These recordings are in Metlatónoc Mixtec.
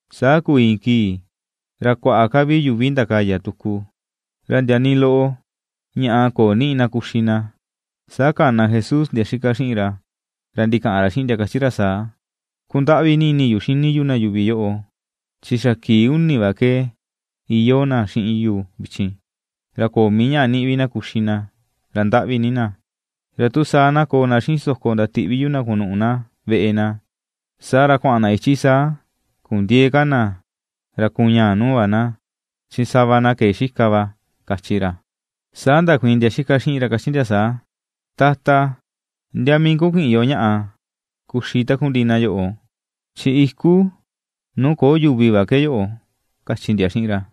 Saa kuu iin kii ra kuaꞌa ka vi yuvi ndakaya tuku. Ra ndia nii loꞌo ñaꞌa köo niꞌi na kuxi na, saa kana Jesús ndia xika xiꞌin ra, ra ndikaꞌan ra xiꞌin ndia kachi ra saa: ―Kundaꞌvi ni ini yu xini yu na yuvi yoꞌo, chi xa kii uni va ke iyoo na xiꞌin yu vichin, ra köo mii ñaꞌa niꞌi na kuxi vi na ra ndaꞌvi ni na. Ra tu saa na koo na xiꞌin so̱kò ndatiꞌvi yu na kunuꞌu na veꞌe na, saa ra kuaꞌan na ichi saa kundiëe ka na ra kuñaa nuu va na, chin sava na ke̱e xika va ―kachi ra. Saa ndakuiin ndia xika xiꞌin ra kachi ndia saa: ―Tata, ¿ndia mii ku kiꞌin yo ñaꞌa kuxi takundiꞌi na yoꞌo? Chi iku nuu köo yuvi va ke yoꞌo ―kachi ndia xiꞌin ra.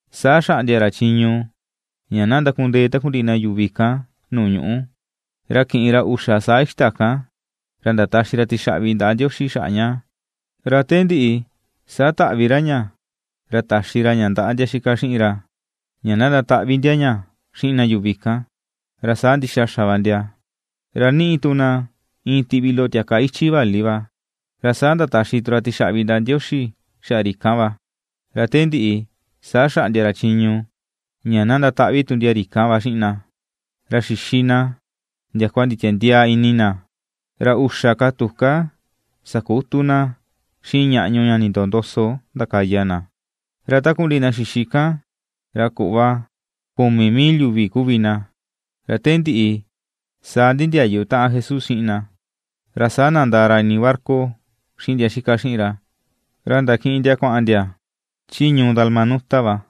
Saa xaꞌndia ra chiñu ña na ndakundee takundiꞌi na yuvi kan nuu ñuꞌu. Ra kiꞌin ra uxa saa ixta kan, ra ndataxi ra tixaꞌvi ndaꞌa Ndioxi xaꞌa ña, ra te ndiꞌi saa taꞌvi ra ña ra taxi ra ña ndaꞌa ndia xika xiꞌin ra, ña na ndataꞌvi ndia ña xiꞌin na yuvi kan; ra saa ndixa xa va ndia. Ra niꞌi tu na iin tiꞌvi loꞌo tiaka ichi vali va, ra saa ndataxi tu ra tixaꞌvi ndaꞌa Ndioxi xaꞌa ri kan va. Ra te ndiꞌi saa xaꞌndia ra chiñu ña na ndataꞌvi tu ndia ri kan va xiꞌin na. Ra xixi na ndiakua nditiandiaa ini na. Ra uxa ka tuká sakutu na xiꞌin ñaꞌñu ña nindoo ndoso ndakaya na. Ra takundiꞌi na xixi kan ra kuꞌva kumi mil yuvi kuvi na, ra te ndiꞌi saa ndindiayu taꞌan Jesús xiꞌin na. Ra saa nandaa ra ini barca xiꞌin ndia xika xiꞌin ra, ra ndakiꞌin ndia kuaꞌan ndia chi ñuu Dalmanuta va.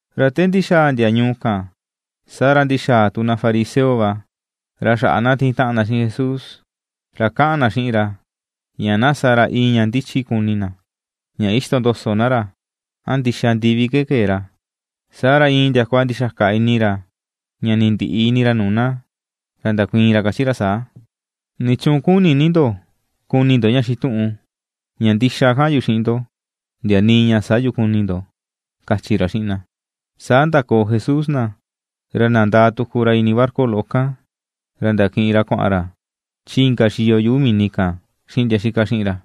Ra te ndixaa ndia ñuu kan, saa ra ndixaa tu na fariseo va ra xaꞌa na tiin taꞌan na xiꞌin Jesús, ra kaꞌan na xiꞌin ra ña na sa ra iin ña ndichi kuni na, ña ixtondoso na ra, a ndixa ndivi ke kee ra. Saa ra iin ndiakua ndixaka ini ra, ña ndindiꞌi ini ra nuu na, ra ndakuiin ra kachi ra saa: ―¿Nichuun kuni̱ ni ndo kuni ndo ña xituꞌun? Ña ndixa kaꞌan yu xiꞌin ndo, ndia nii ña sä yu kuni ndo ―kachi ra xiꞌin na. Saa ndakoo Jesús na, ra nandaa tuku ra ini barca loꞌo kan, ra ndakiꞌin ra kuaꞌan ra chi inka xiyo yuꞌu mini kan xiꞌin ndia xika xiꞌin ra.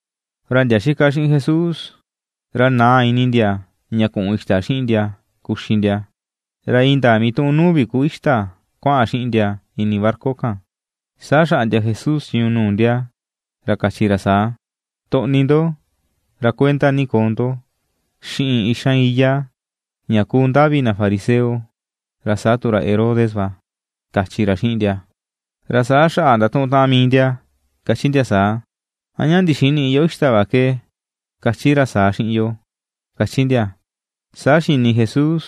Ra ndia xika xiꞌin Jesús, ra naa ini ndia ña kuꞌun ixta xiꞌin ndia kuxi ndia, ra indaa mituꞌun nuu vi ku ixta kuaꞌan xiꞌin ndia ini barca kan. Saa xaꞌndia Jesús chiñu nuu ndia ra kachi ra saa: ―Toꞌni ndo, ra kuenda ni koo ndo xiꞌin ixan iyá ña kuu ndavi na fariseo ra saa tu ra Herodes va ―kachi ra xiꞌin ndia. Ra saa xaꞌa ndatuꞌun taꞌan mii ndia kachi ndia saa: ―A ña ndixinïꞌi yo ixta va ke kachi ra saa xiꞌin yo ―kachi ndia. Saa xini Jesús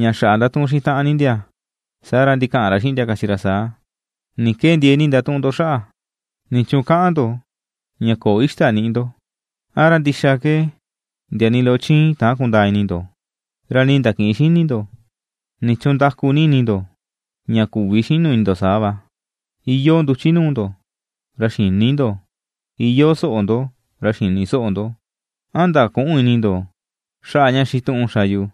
ña xaꞌa ndatuꞌun xiꞌin taꞌan ni ndia, saa ra ndikaꞌan ra xiꞌin ndia kachi ra saa: ―¿Ni ke ndiee ni ndatuꞌun ndo xaꞌa? ¿Nichuun kaꞌan ndo ña köo ixta niꞌi ndo? ¿A ra ndixa ke ndia nii loꞌo chiin täan kundaa ini ndo, ra nii ndakïꞌin xini ndo? ¿Nichuun ndaku ni ini ndo ña küvi xinu ini ndo saa va? Iyoo nduchi nuu ndo ra xïni ndo; iyoo soꞌo ndo ra xïni soꞌo ndo. ¿A ndaküꞌun ini ndo xaꞌa ña xituꞌun xa yu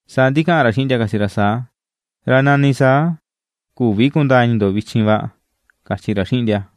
Saa ndikaꞌan ra xiꞌin ndia kachi ra saa: ―Ra nani saa küvi kundaa ini ndo vichin va ―kachi ra xiꞌin ndia.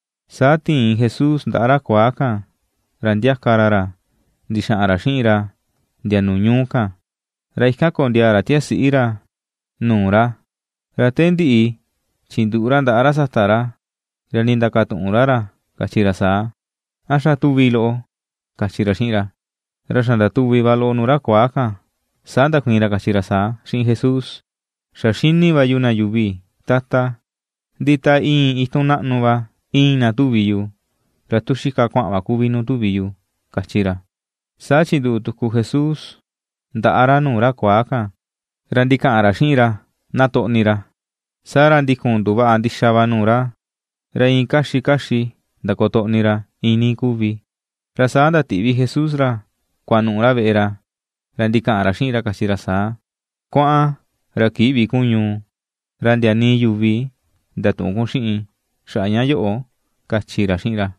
Saa tiin Jesús ndaꞌa ra kuaa kan ra ndiaka ra ra ndixaꞌan ra xiꞌin ra ndia nuu ñuu kan, ra ikan kondiaa ra tiasiꞌi ra nuu ra, ra te ndiꞌi chinduꞌu ra ndaꞌa ra sata ra, ra ndindakatuꞌun ra ra kachi ra saa: ―¿A xa tuvi loꞌo? ―kachi ra xiꞌin ra. Ra xa ndatuvì va loꞌo nuu ra kuaa kan, Saa ndakuiin ra kachi ra saa xiꞌin Jesús: ―Xa xini va yu na yuvi, Tata, ndi ta iin itun naꞌnu va, iin na tuvi yu, ra tu xika kuaꞌan va kuvi nuu tuvi yu ―kachi ra. Saa chinduꞌu tuku Jesús ndaꞌa ra nuu ra kuaa kan, ra ndikaꞌan ra xiꞌin ra na toꞌni ra, saa ra ndikun nduvaꞌa ndixa va nuu ra, ra iin kaxi kaxi ndakotoꞌni ra iinii kuvi. Ra saa ndatiꞌvi Jesús ra kuanuꞌu ra veꞌe ra, ra ndikaꞌan ra xiꞌin ra kachi ra saa: ―Kuaꞌan, ra kïꞌvi kun ñuu, ra ndia nii yuvi ndatüꞌun kun xiꞌin xaꞌa ña yoꞌo ―kachi ra xiꞌin ra.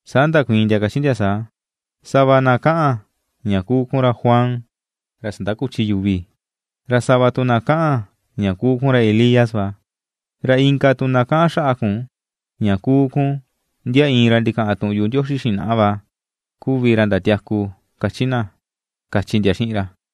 Saa ndakuiin ndia kachi ndia saa: ―Sava na kaꞌan ña kuu kun ra Juan ra sandakuchi yuvi, ra sava tu na kaꞌan ña kuu kun ra Elías va, ra inka tu na kaꞌan xaꞌa kun ña kuu kun ndia iin ra ndikaꞌan tuꞌun yuꞌu Ndioxi xinaꞌa va kuvi ra ndatiaku, kachi na ―kachi ndia xiꞌin ra.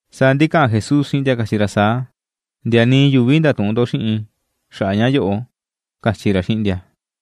Saa ndikaꞌan Jesús xiꞌin ndia kachi ra saa: ―Ndia nii yuvi ndatüꞌun ndo xiꞌin xaꞌa ña yoꞌo ―kachi ra xiꞌin ndia.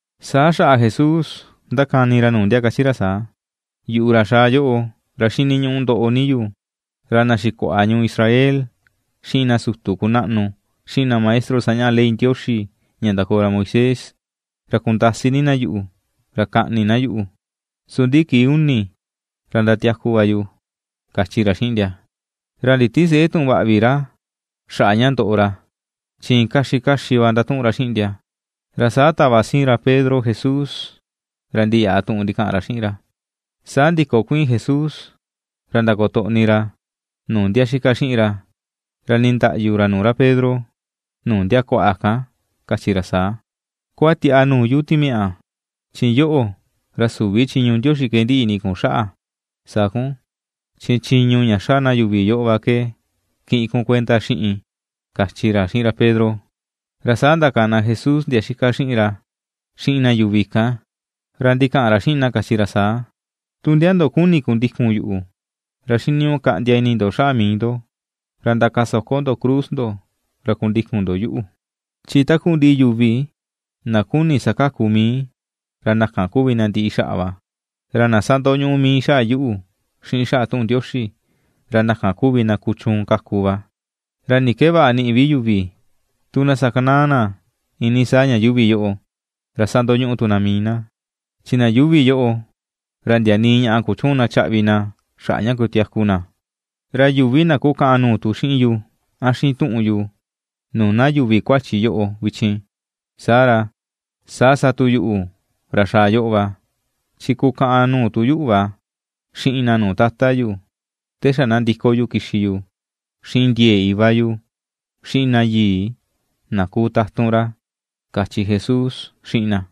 Saa xaꞌa Jesús ndakani ra nuu ndia kachi ra saa: ―Yuꞌu, ra xaa yoꞌo, ra xiniñuꞌu ndoꞌo ni yu, ra na xikuaꞌa ñuu Israel, xiꞌin na sutu kunaꞌnu, xiꞌin na maestro sañaꞌa ley Ndioxi ña ndakoo ra Moisés, ra kundasi ni na yuꞌu, ra kaꞌni na yuꞌu, su ndi kii uni ra ndatiaku va yu ―kachi ra xiꞌin ndia. Ra nditisëꞌe tuꞌun vaꞌa vi ra xaꞌa ña ndoꞌo ra chi iin kaxi kaxi va ndatuꞌun ra xiꞌin ndia. Ra saa tava siin ra Pedro Jesús ra ndiyaꞌa tuꞌun ndikaꞌan ra xiꞌin ra. Saa ndikokuiin Jesús ra ndakotoꞌni ra nuu ndia xika xiꞌin ra, ra nindaꞌyu ra nuu ra Pedro nuu ndia kuaꞌa kan, kachi ra saa: ―¡Kuatiaꞌa nuu yu, timiaꞌa! Chi yoꞌo, ra süvi chiñu Ndioxi ke ndiꞌi ini kun xaꞌa sa kun chi chiñu ña xa na yuvi yoꞌo va ke kiꞌin kun kuenda xiꞌin ―kachi ra xiꞌin ra Pedro. Ra saa ndakana Jesús ndia xika xiꞌin ra, xiꞌin na yuvi kan, ra ndikaꞌan ra xiꞌin na kachi ra saa: ―Tu ndia ndo kuni̱ kundikun yuꞌu, ra xiniñuꞌu kaꞌndia ini ndo xaꞌa mii ndo, ra ndakasoko ndo cruz ndo ra kundikun ndo yuꞌu. Saa chi yuvi na kuni̱ sakaku mii ra na kan kuvi na ndiꞌi xaꞌa va. Ra na sandoñuꞌu mii xaꞌa yuꞌu, xiꞌin xaꞌa tuꞌun Ndioxi, ra na kan kuvi na kuchuun kaku va. ¿Ra ni ke vaꞌa niꞌi vi yuvi, tu na sakanaa na iinii saa ña yuuvi yoꞌo, ra sandoñuꞌu tu na mii na? Chi na yuuvi yoꞌo, ra ndia nii ñaꞌa kuchüun na chaꞌvi na xaꞌa ña kutiaku na. Ra yuvi na kukaꞌan nuu tu xiꞌin yu, a xiꞌin tuꞌun yu nuu na yuvi kuachi yoꞌo vichin, saa ra, saa sa tu yuꞌu, ra xaa yoꞌo va, chi kukaꞌan nuu tu yuꞌu va xiꞌin na nuu Tata yu, ta xa na ndiko yu kixi yu xiꞌin ndie̱e̱ Iva yu, xiꞌin na yii na ku tatun ra ―kachi Jesús xiꞌin na.